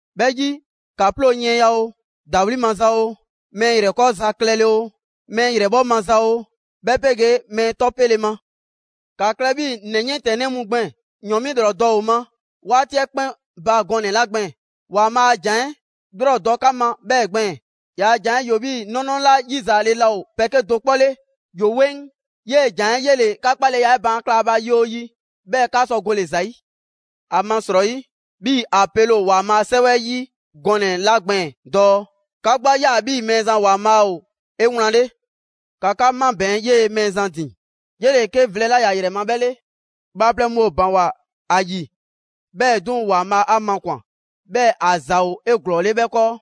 'Bhɛ 'yi, ‑ka 'ploo yiɛnya oo, ‑dawli' maza oo, mɛɛ ‑yrɛkɔɔza klɛle oo, mɛɛ ‑yrɛbhɔ' maza oo, 'bhɛ 'pegee mɛɛ 'tɔ 'pele ma. ‑Kaa klɛ 'bhii‑ ‑nɛ 'yiɛntɛnnɛ mu gbɛɛn‑: ‑yɔn 'mi ‑lrɔ dɔ ‑o ma 'waati 'ɛ 'kpɛn ba gɔnɛ‑ 'la gbɛɛn‑, ‑Waanbhaa' a ‑jan 'ɛ 'lrɔ dɔ 'ka ma 'bhɛɛ‑ gbɛɛn‑. ‑Yaa' ‑jan 'ɛ ‑yoo 'bhii‑ 'nɔnɔ 'la 'yizaale laa ‑o pɛ 'kedo‑ 'kpɔ 'le, ‑yoo 'weŋ. 'Yee‑ ‑jan 'ɛ 'yele‑ 'ka 'kpaleya 'ɛ baan' kla ‑a ba yi 'oo yi, 'bhɛɛ‑ 'ka sɔ gole‑ ‑za 'yi. ‑Amasrɔyi, 'bhii‑ ‑a pele ‑o ‑Waanbhaa' a 'Sɛwɛ 'ɛ 'yi gɔnɛ‑ 'la gbɛɛn‑ dɔɔ: «'Ka 'gbu 'a ꞊ya 'bhii‑ Mɛɛzan ‑Waanbhaa' ‑o 'ewlanle.» ‑Ka 'ka 'mabɛɛn‑ 'yee‑ Mɛɛzan ‑din. 'Yele‑ 'ke vlɛ 'la ‑ya ‑yrɛ ma 'bhɛ 'le. Bhaaplɛŋ mu ‑o ‑baŋgwa ‑a ‑yi, 'bhɛɛ‑ 'duŋ‑ ‑Waanbhaa' 'a makwan꞊, 'bhɛɛ‑ ‑a ‑za ‑o 'eglɔɔle 'bhɛ 'kɔɔ.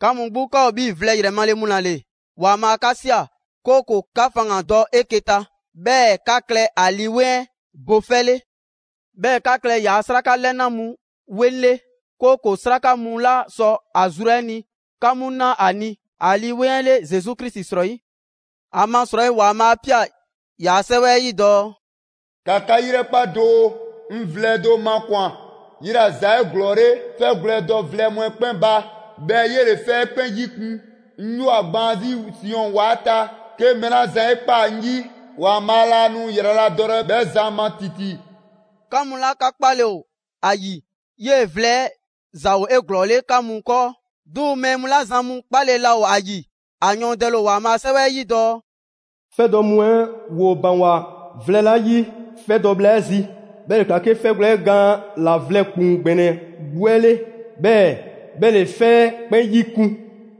'Ka mu 'gbu, 'ka ‑o 'bhii‑ vlɛ ‑yrɛ male mu ‑la ‑le, ‑Waanbhaa 'ka ꞊sia, 'kooko‑ 'ka faŋgandɔ dɔ 'eke‑ ta, 'bhɛɛ‑ 'ka klɛ ‑a Lii 'Weŋ 'ɛ bo 'fɛ 'le. 'Bhɛɛ‑ ‑ka klɛ ‑yaa' 'sraka 'lɛna mu 'weŋ 'le, 'kooko‑ 'sraka mu 'la sɔ ‑a zru 'ɛ ni 'ka 'mu na ‑a ni ‑a Lii 'Weŋ 'ɛ 'le Zesu Krisi srɔyi'. ‑Amasrɔyi ‑Waanbhaa' 'a ꞊pia ‑yaa' 'Sɛwɛ 'ɛ 'yi dɔɔ: «‑Ka 'ka 'yrɛkpa doo, 'ŋ vlɛ do makwan‑. 'Yela‑ ‑za ‑o 'eglɔɔle 'fɛgwlɛ‑ 'ɛ dɔ vlɛ mu 'ɛ 'kpɛn ba, 'bhɛɛ‑ 'yele‑ 'fɛ 'ɛ 'kpɛn 'yikun‑ 'Ŋ 'yoo‑ ‑a gbaan 'zi Siɔn ‑wa 'ɛ ta. 'Ke mɛɛ 'la zan 'e ꞊kpaa ‑a ‑yi, ‑Waanbhaa' laa nu ‑yraladɔlɛ 'bhɛ zan ma ‑titi.» 'Ka mu 'la 'ka 'kpale‑ ‑o ‑a ‑yi, 'yee‑ vlɛ 'ɛ ‑za ‑o 'eglɔɔle 'ka mu 'kɔɔ. 'Duŋ‑ mɛɛ mu 'la zan mu 'kpale‑ laa ‑o ‑a ‑yi, ‑a yɔɔndɛle ‑o ‑Waanbhaa' a 'Sɛwɛ 'ɛ yi dɔɔ: «'Fɛ dɔ mu 'ɛ ‑woo ‑baŋgwa vlɛ 'la 'yi 'fɛ dɔ bhla 'ɛ 'zi, 'bhɛ ‑le ꞊kla 'ke 'fɛgwlɛ‑ 'ɛ gaan ‑la vlɛ ‑kpuŋ ‑gbɛnɛ 'gbu 'ɛ 'le, 'bhɛɛ‑ 'bhɛ ‑le 'fɛ 'ɛ 'kpɛn 'yikun.»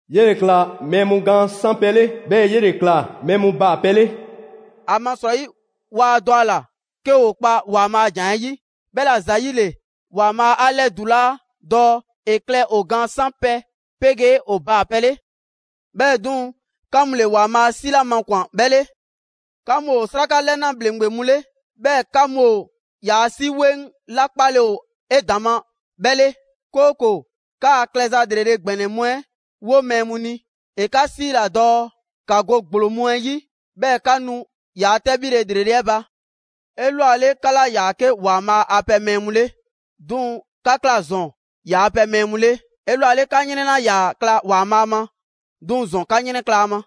«'Yele‑ ꞊kla mɛɛ mu gaan 'sanpɛ‑ 'le, 'bhɛɛ‑ 'yele‑ ꞊kla mɛɛ mu baapɛ 'le.» ‑Amasrɔyi waa dɔ ‑a ‑la 'ke ‑woo kpa ‑Waanbhaa' a ‑jan 'ɛ 'yi. 'Bhɛla‑ ‑zayile, ‑Waanbhaa' 'a ‑lɛdulaa dɔɔ ‑e klɛ ‑o gaan 'sanpɛ‑ pegee ‑o baapɛ 'le. 'Bhɛɛ‑ 'duŋ‑, 'ka mu ‑le ‑Waanbhaa' 'si 'la makwan‑ 'bhɛ 'le. 'Ka mu ‑o 'sraka 'lɛna ‑bhleŋgbe mu 'le, 'bhɛɛ‑ 'ka mu ‑o ‑yaa' 'si 'weŋ 'la 'kpale‑ ‑o 'edaŋma 'bhɛ 'le, 'kooko‑ 'kaa klɛza 'lrele‑ ‑gbɛnɛ mu 'ɛ wo mɛɛ mu ni. ‑E 'ka 'siila‑ dɔɔ 'ka go ‑gblo mu 'ɛ 'yi 'bhɛɛ‑ 'ka 'nu ‑yaa' 'tɛbhile ‑lrele' 'ɛ ba. 'Elwale, 'ka 'laa ‑yaa 'ke ‑Waanbhaa' a pɛ mɛɛ mu 'le, 'duŋ‑ 'ka ꞊kla ‑zɔn ‑yaa' pɛ mɛɛ mu 'le. 'Elwale, 'ka 'yrɛn 'laa ‑yaa ꞊kla ‑Waanbhaa' ma, 'duŋ‑ ‑zɔn 'ka 'yrɛnkla‑ ‑a ma.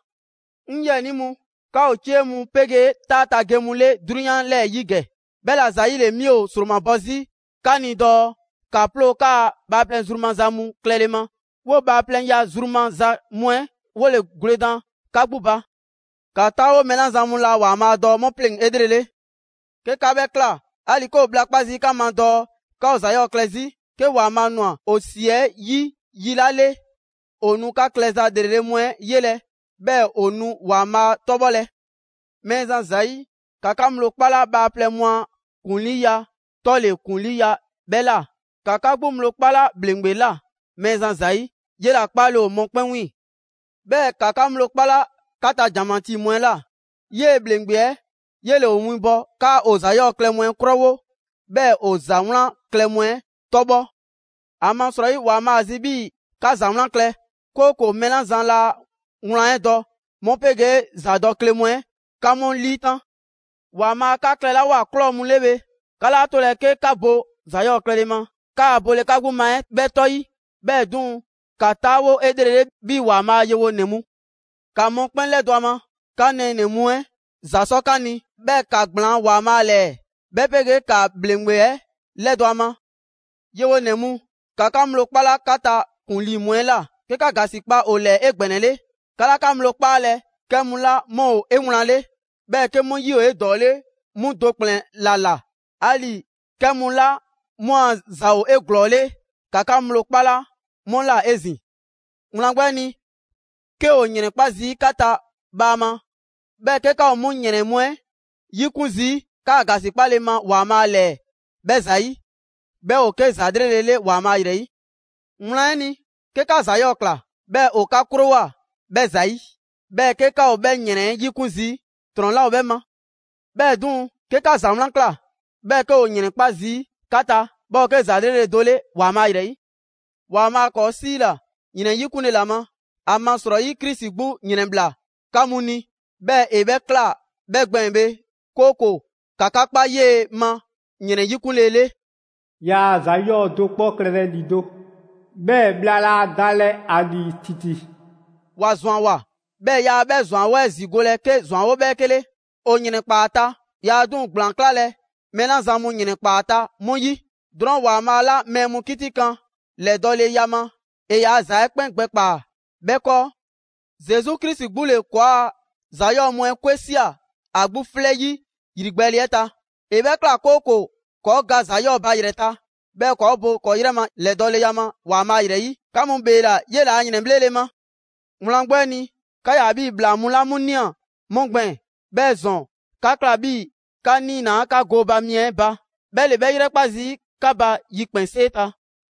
'Ŋ 'yiɛnii mu, 'ka ‑o 'cie mu 'pegee 'taa ta ge mu 'le 'drunyan 'lɛɛ‑ 'yi ‑gɛ. 'Bhɛla‑ ‑zayile, 'mi ‑o 'sromabɔ 'zi 'ka ni dɔɔ ‑ka 'ploo 'kaa‑ bhaaplɛŋ zru maza mu klɛle ma. 'Woo‑ bhaaplɛŋya zru maza mu 'ɛ 'wole‑ gwledan 'ka 'gbu ba. ‑Ka 'taawo mɛɛ 'la zan mu laa ‑Waanbhaa' dɔ 'mu pleŋ‑ 'elrele. 'Ke 'ka 'bhɛ ꞊kla, 'ali‑ 'ke ‑o bhla 'kpa zii' 'ka ma dɔɔ 'ka ‑o ‑za 'yɔɔ‑ klɛ 'zi, 'ke ‑Waanbhaa' ꞊nwa ‑o ‑si 'ɛ 'yi yi 'la 'le, ‑o nu 'ka klɛza ‑lrele' mu 'ɛ 'yelɛ‑ 'bhɛɛ‑ ‑o nu ‑Waanbhaa' 'tɔbhɔlɛ. Mɛɛzan ‑zayi', ‑ka 'ka ŋgblo 'kpala bhaaplɛŋ mu a ‑kuŋliiya 'tɔle ‑kuŋliiya 'bhɛ ꞊la: ‑ka 'ka 'gbu ŋgblo 'kpala ‑bhleŋgbe ꞊la, Mɛɛzan ‑zayi', 'yela‑ 'kpaale‑ ‑o mɔkpɛn' 'wiiŋ‑. 'Bhɛɛ‑ ‑ka 'ka ŋgblo 'kpala 'ka ta ‑janmatii mu 'ɛ ꞊la. 'Yee‑ ‑bhleŋgbe 'ɛ 'yele‑ ‑o winbɔ 'kaa ‑o ‑za 'yɔɔ‑ klɛ mu 'ɛ 'krowo, 'bhɛɛ‑ ‑o ‑za 'wlan klɛ mu 'ɛ 'tɔbhɔ‑. ‑Amasrɔyi, ‑Waanbhaa' ‑a zi 'bhii‑ 'ka ‑za 'wlan klɛ, 'kooko‑ mɛɛ 'la zan laa wlan 'ɛ dɔ 'mu 'pegee ‑zadɔkle mu 'ɛ 'ka 'mu 'liitan‑. ‑Waanbhaa' 'ka klɛlawoa ꞊klɔ mu 'le bhe, 'ka 'laa 'tolɛ‑ 'ke 'ka bo ‑za 'yɔɔ‑ klɛle ma 'kaa‑ bole 'ka 'gbu ma 'ɛ 'bhɛ 'tɔ 'yi. 'Bhɛɛ‑ 'duŋ‑, ‑ka 'taawo 'elrele 'bhii‑ ‑Waanbhaa' a yewonɛ mu. ‑Ka mɔkpɛn' 'lɛdɔ‑ ‑a ma, 'ka nɛɛnɛ‑ mu 'ɛ ‑za 'sɔ 'ka ni, 'bhɛɛ‑ ‑ka ‑gblaan' ‑Waanbhaa' 'lɛɛ, 'bhɛ 'pegee ‑ka ‑bhleŋgbe 'ɛ 'lɛdɔ‑ ‑a ma. Yewonɛ mu, ‑ka 'ka ŋgblo 'kpala 'ka ta ‑kuŋlii mu 'ɛ ꞊la, 'ke 'ka ‑gasikpa ‑o ‑lɛɛ 'egbɛnɛle. 'Ka 'laa 'ka ŋgblo 'kpaalɛ‑ 'kɛ mu 'la 'mu ‑o 'ewlanle, 'bhɛɛ‑ 'ke 'mu 'yi ‑o 'edɔɔle 'mu do ‑kplɛn ‑la ꞊la. 'Ali‑ 'kɛ mu 'la 'mu a ‑za ‑o 'eglɔɔle ‑ka 'ka ŋgblo 'kpala 'mu ꞊la 'ezin‑. Wlan 'gbu 'ɛ ni, 'ke ‑o ‑yrɛnkpa' zii' 'ka ta bhaama, 'bhɛɛ‑ 'ke 'ka ‑o 'mu ‑yrɛn mu 'ɛ 'yikun zii' 'kaa‑ ‑gasikpale ma ‑Waanbhaa' ‑lɛɛ 'bhɛ ‑zayi', 'bhɛ ‑o 'ke ‑za 'lrele‑ le ‑Waanbhaa ‑yrɛ 'yi. Wlan 'ɛ ni, 'ke 'ka ‑za 'yɔɔ‑ ꞊kla, 'bhɛɛ‑ ‑o 'ka 'krowoa‑ 'bhɛ ‑zayi', 'bhɛɛ‑ 'ke 'ka ‑o 'bhɛ ‑yrɛn 'ɛ 'yikun zii', ‑trɔn 'laa ‑o 'bhɛ ma. 'Bhɛɛ‑ 'duŋ‑, 'ke 'ka ‑za 'wlan ꞊kla, 'bhɛɛ‑ 'ke ‑woo ‑yrɛnkpa' zii' 'ka ta, 'bhɛ ‑o 'ke ‑za 'lrele‑ do 'le ‑Waanbhaa' ‑yrɛ 'yi. ‑Waanbhaa' ‑kɔɔ' 'siila‑ ‑yrɛn 'yikunle ‑la ma. ‑Amasrɔyi, Krisi 'gbu ‑yrɛnbhla 'ka mu ni, 'bhɛɛ‑ ‑e 'bhɛ ꞊kla 'bhɛ gbɛɛn‑ bhe, 'kooko‑ 'ka 'ka kpa 'yee‑ ma ‑yrɛn 'yikunle 'le. Yaa ‑za 'yɔɔ‑ do 'kpɔ klɛlɛ ‑lido', 'bhɛɛ‑ bhla laa dalɛ ‑a ‑lii ‑titi. ‑Wa ‑zwanwoa, 'bhɛɛ‑ yaa 'bhɛ ‑zwanwo' 'ɛ zigolɛ 'ke ‑zwanwo' 'bhɛɛke 'le. ‑O ‑yrɛnkpaa ‑a ta, yaa 'duŋ‑ ‑gblaan 'klalɛ‑ mɛɛ 'la zan mu ‑yrɛnkpaa ‑a ta 'mu 'yi. Drɔɔn' ‑Waanbhaa' 'la mɛɛ mu 'kitikan ‑lɛdɔɔleya ma, ‑e ‑yaa' ‑za 'ɛ 'kpɛn gbɛkpaa‑ 'bhɛ 'kɔɔ. Zesu Krisi 'gbu ‑le ‑kɔɔa' ‑za 'yɔɔ‑ mu 'kwe ꞊sia ‑a 'gbu 'flɛ 'yi ‑yrigbɛɛle 'ɛ ta. ‑E 'bhɛ ꞊kla, 'kooko‑ ‑kɔɔ' ga ‑za 'yɔɔ‑ ba ‑yrɛ ta, 'bhɛɛ‑ ‑kɔɔ' bo ‑kɔɔ' 'yrɛ ma ‑lɛdɔɔleya ma ‑Waanbhaa' ‑yrɛ 'yi. 'Ka mu ‑bheela 'yela‑ a ‑yrɛnbhlele ma. Wlan 'gbu 'ɛ ni, 'ka 'yaa‑ 'bhii‑ ‑bhlaa mu 'la 'mu 'la ꞊nia 'mu gbɛɛn‑; 'bhɛɛ‑ ‑zɔn, 'ka ꞊kla 'bhii 'ka 'niinaa‑ 'ka gooba mi 'ɛ ba. 'Bhɛ ‑le 'bhɛ 'yrɛkpa‑ zii' 'ka ba yikpɛnsee ta.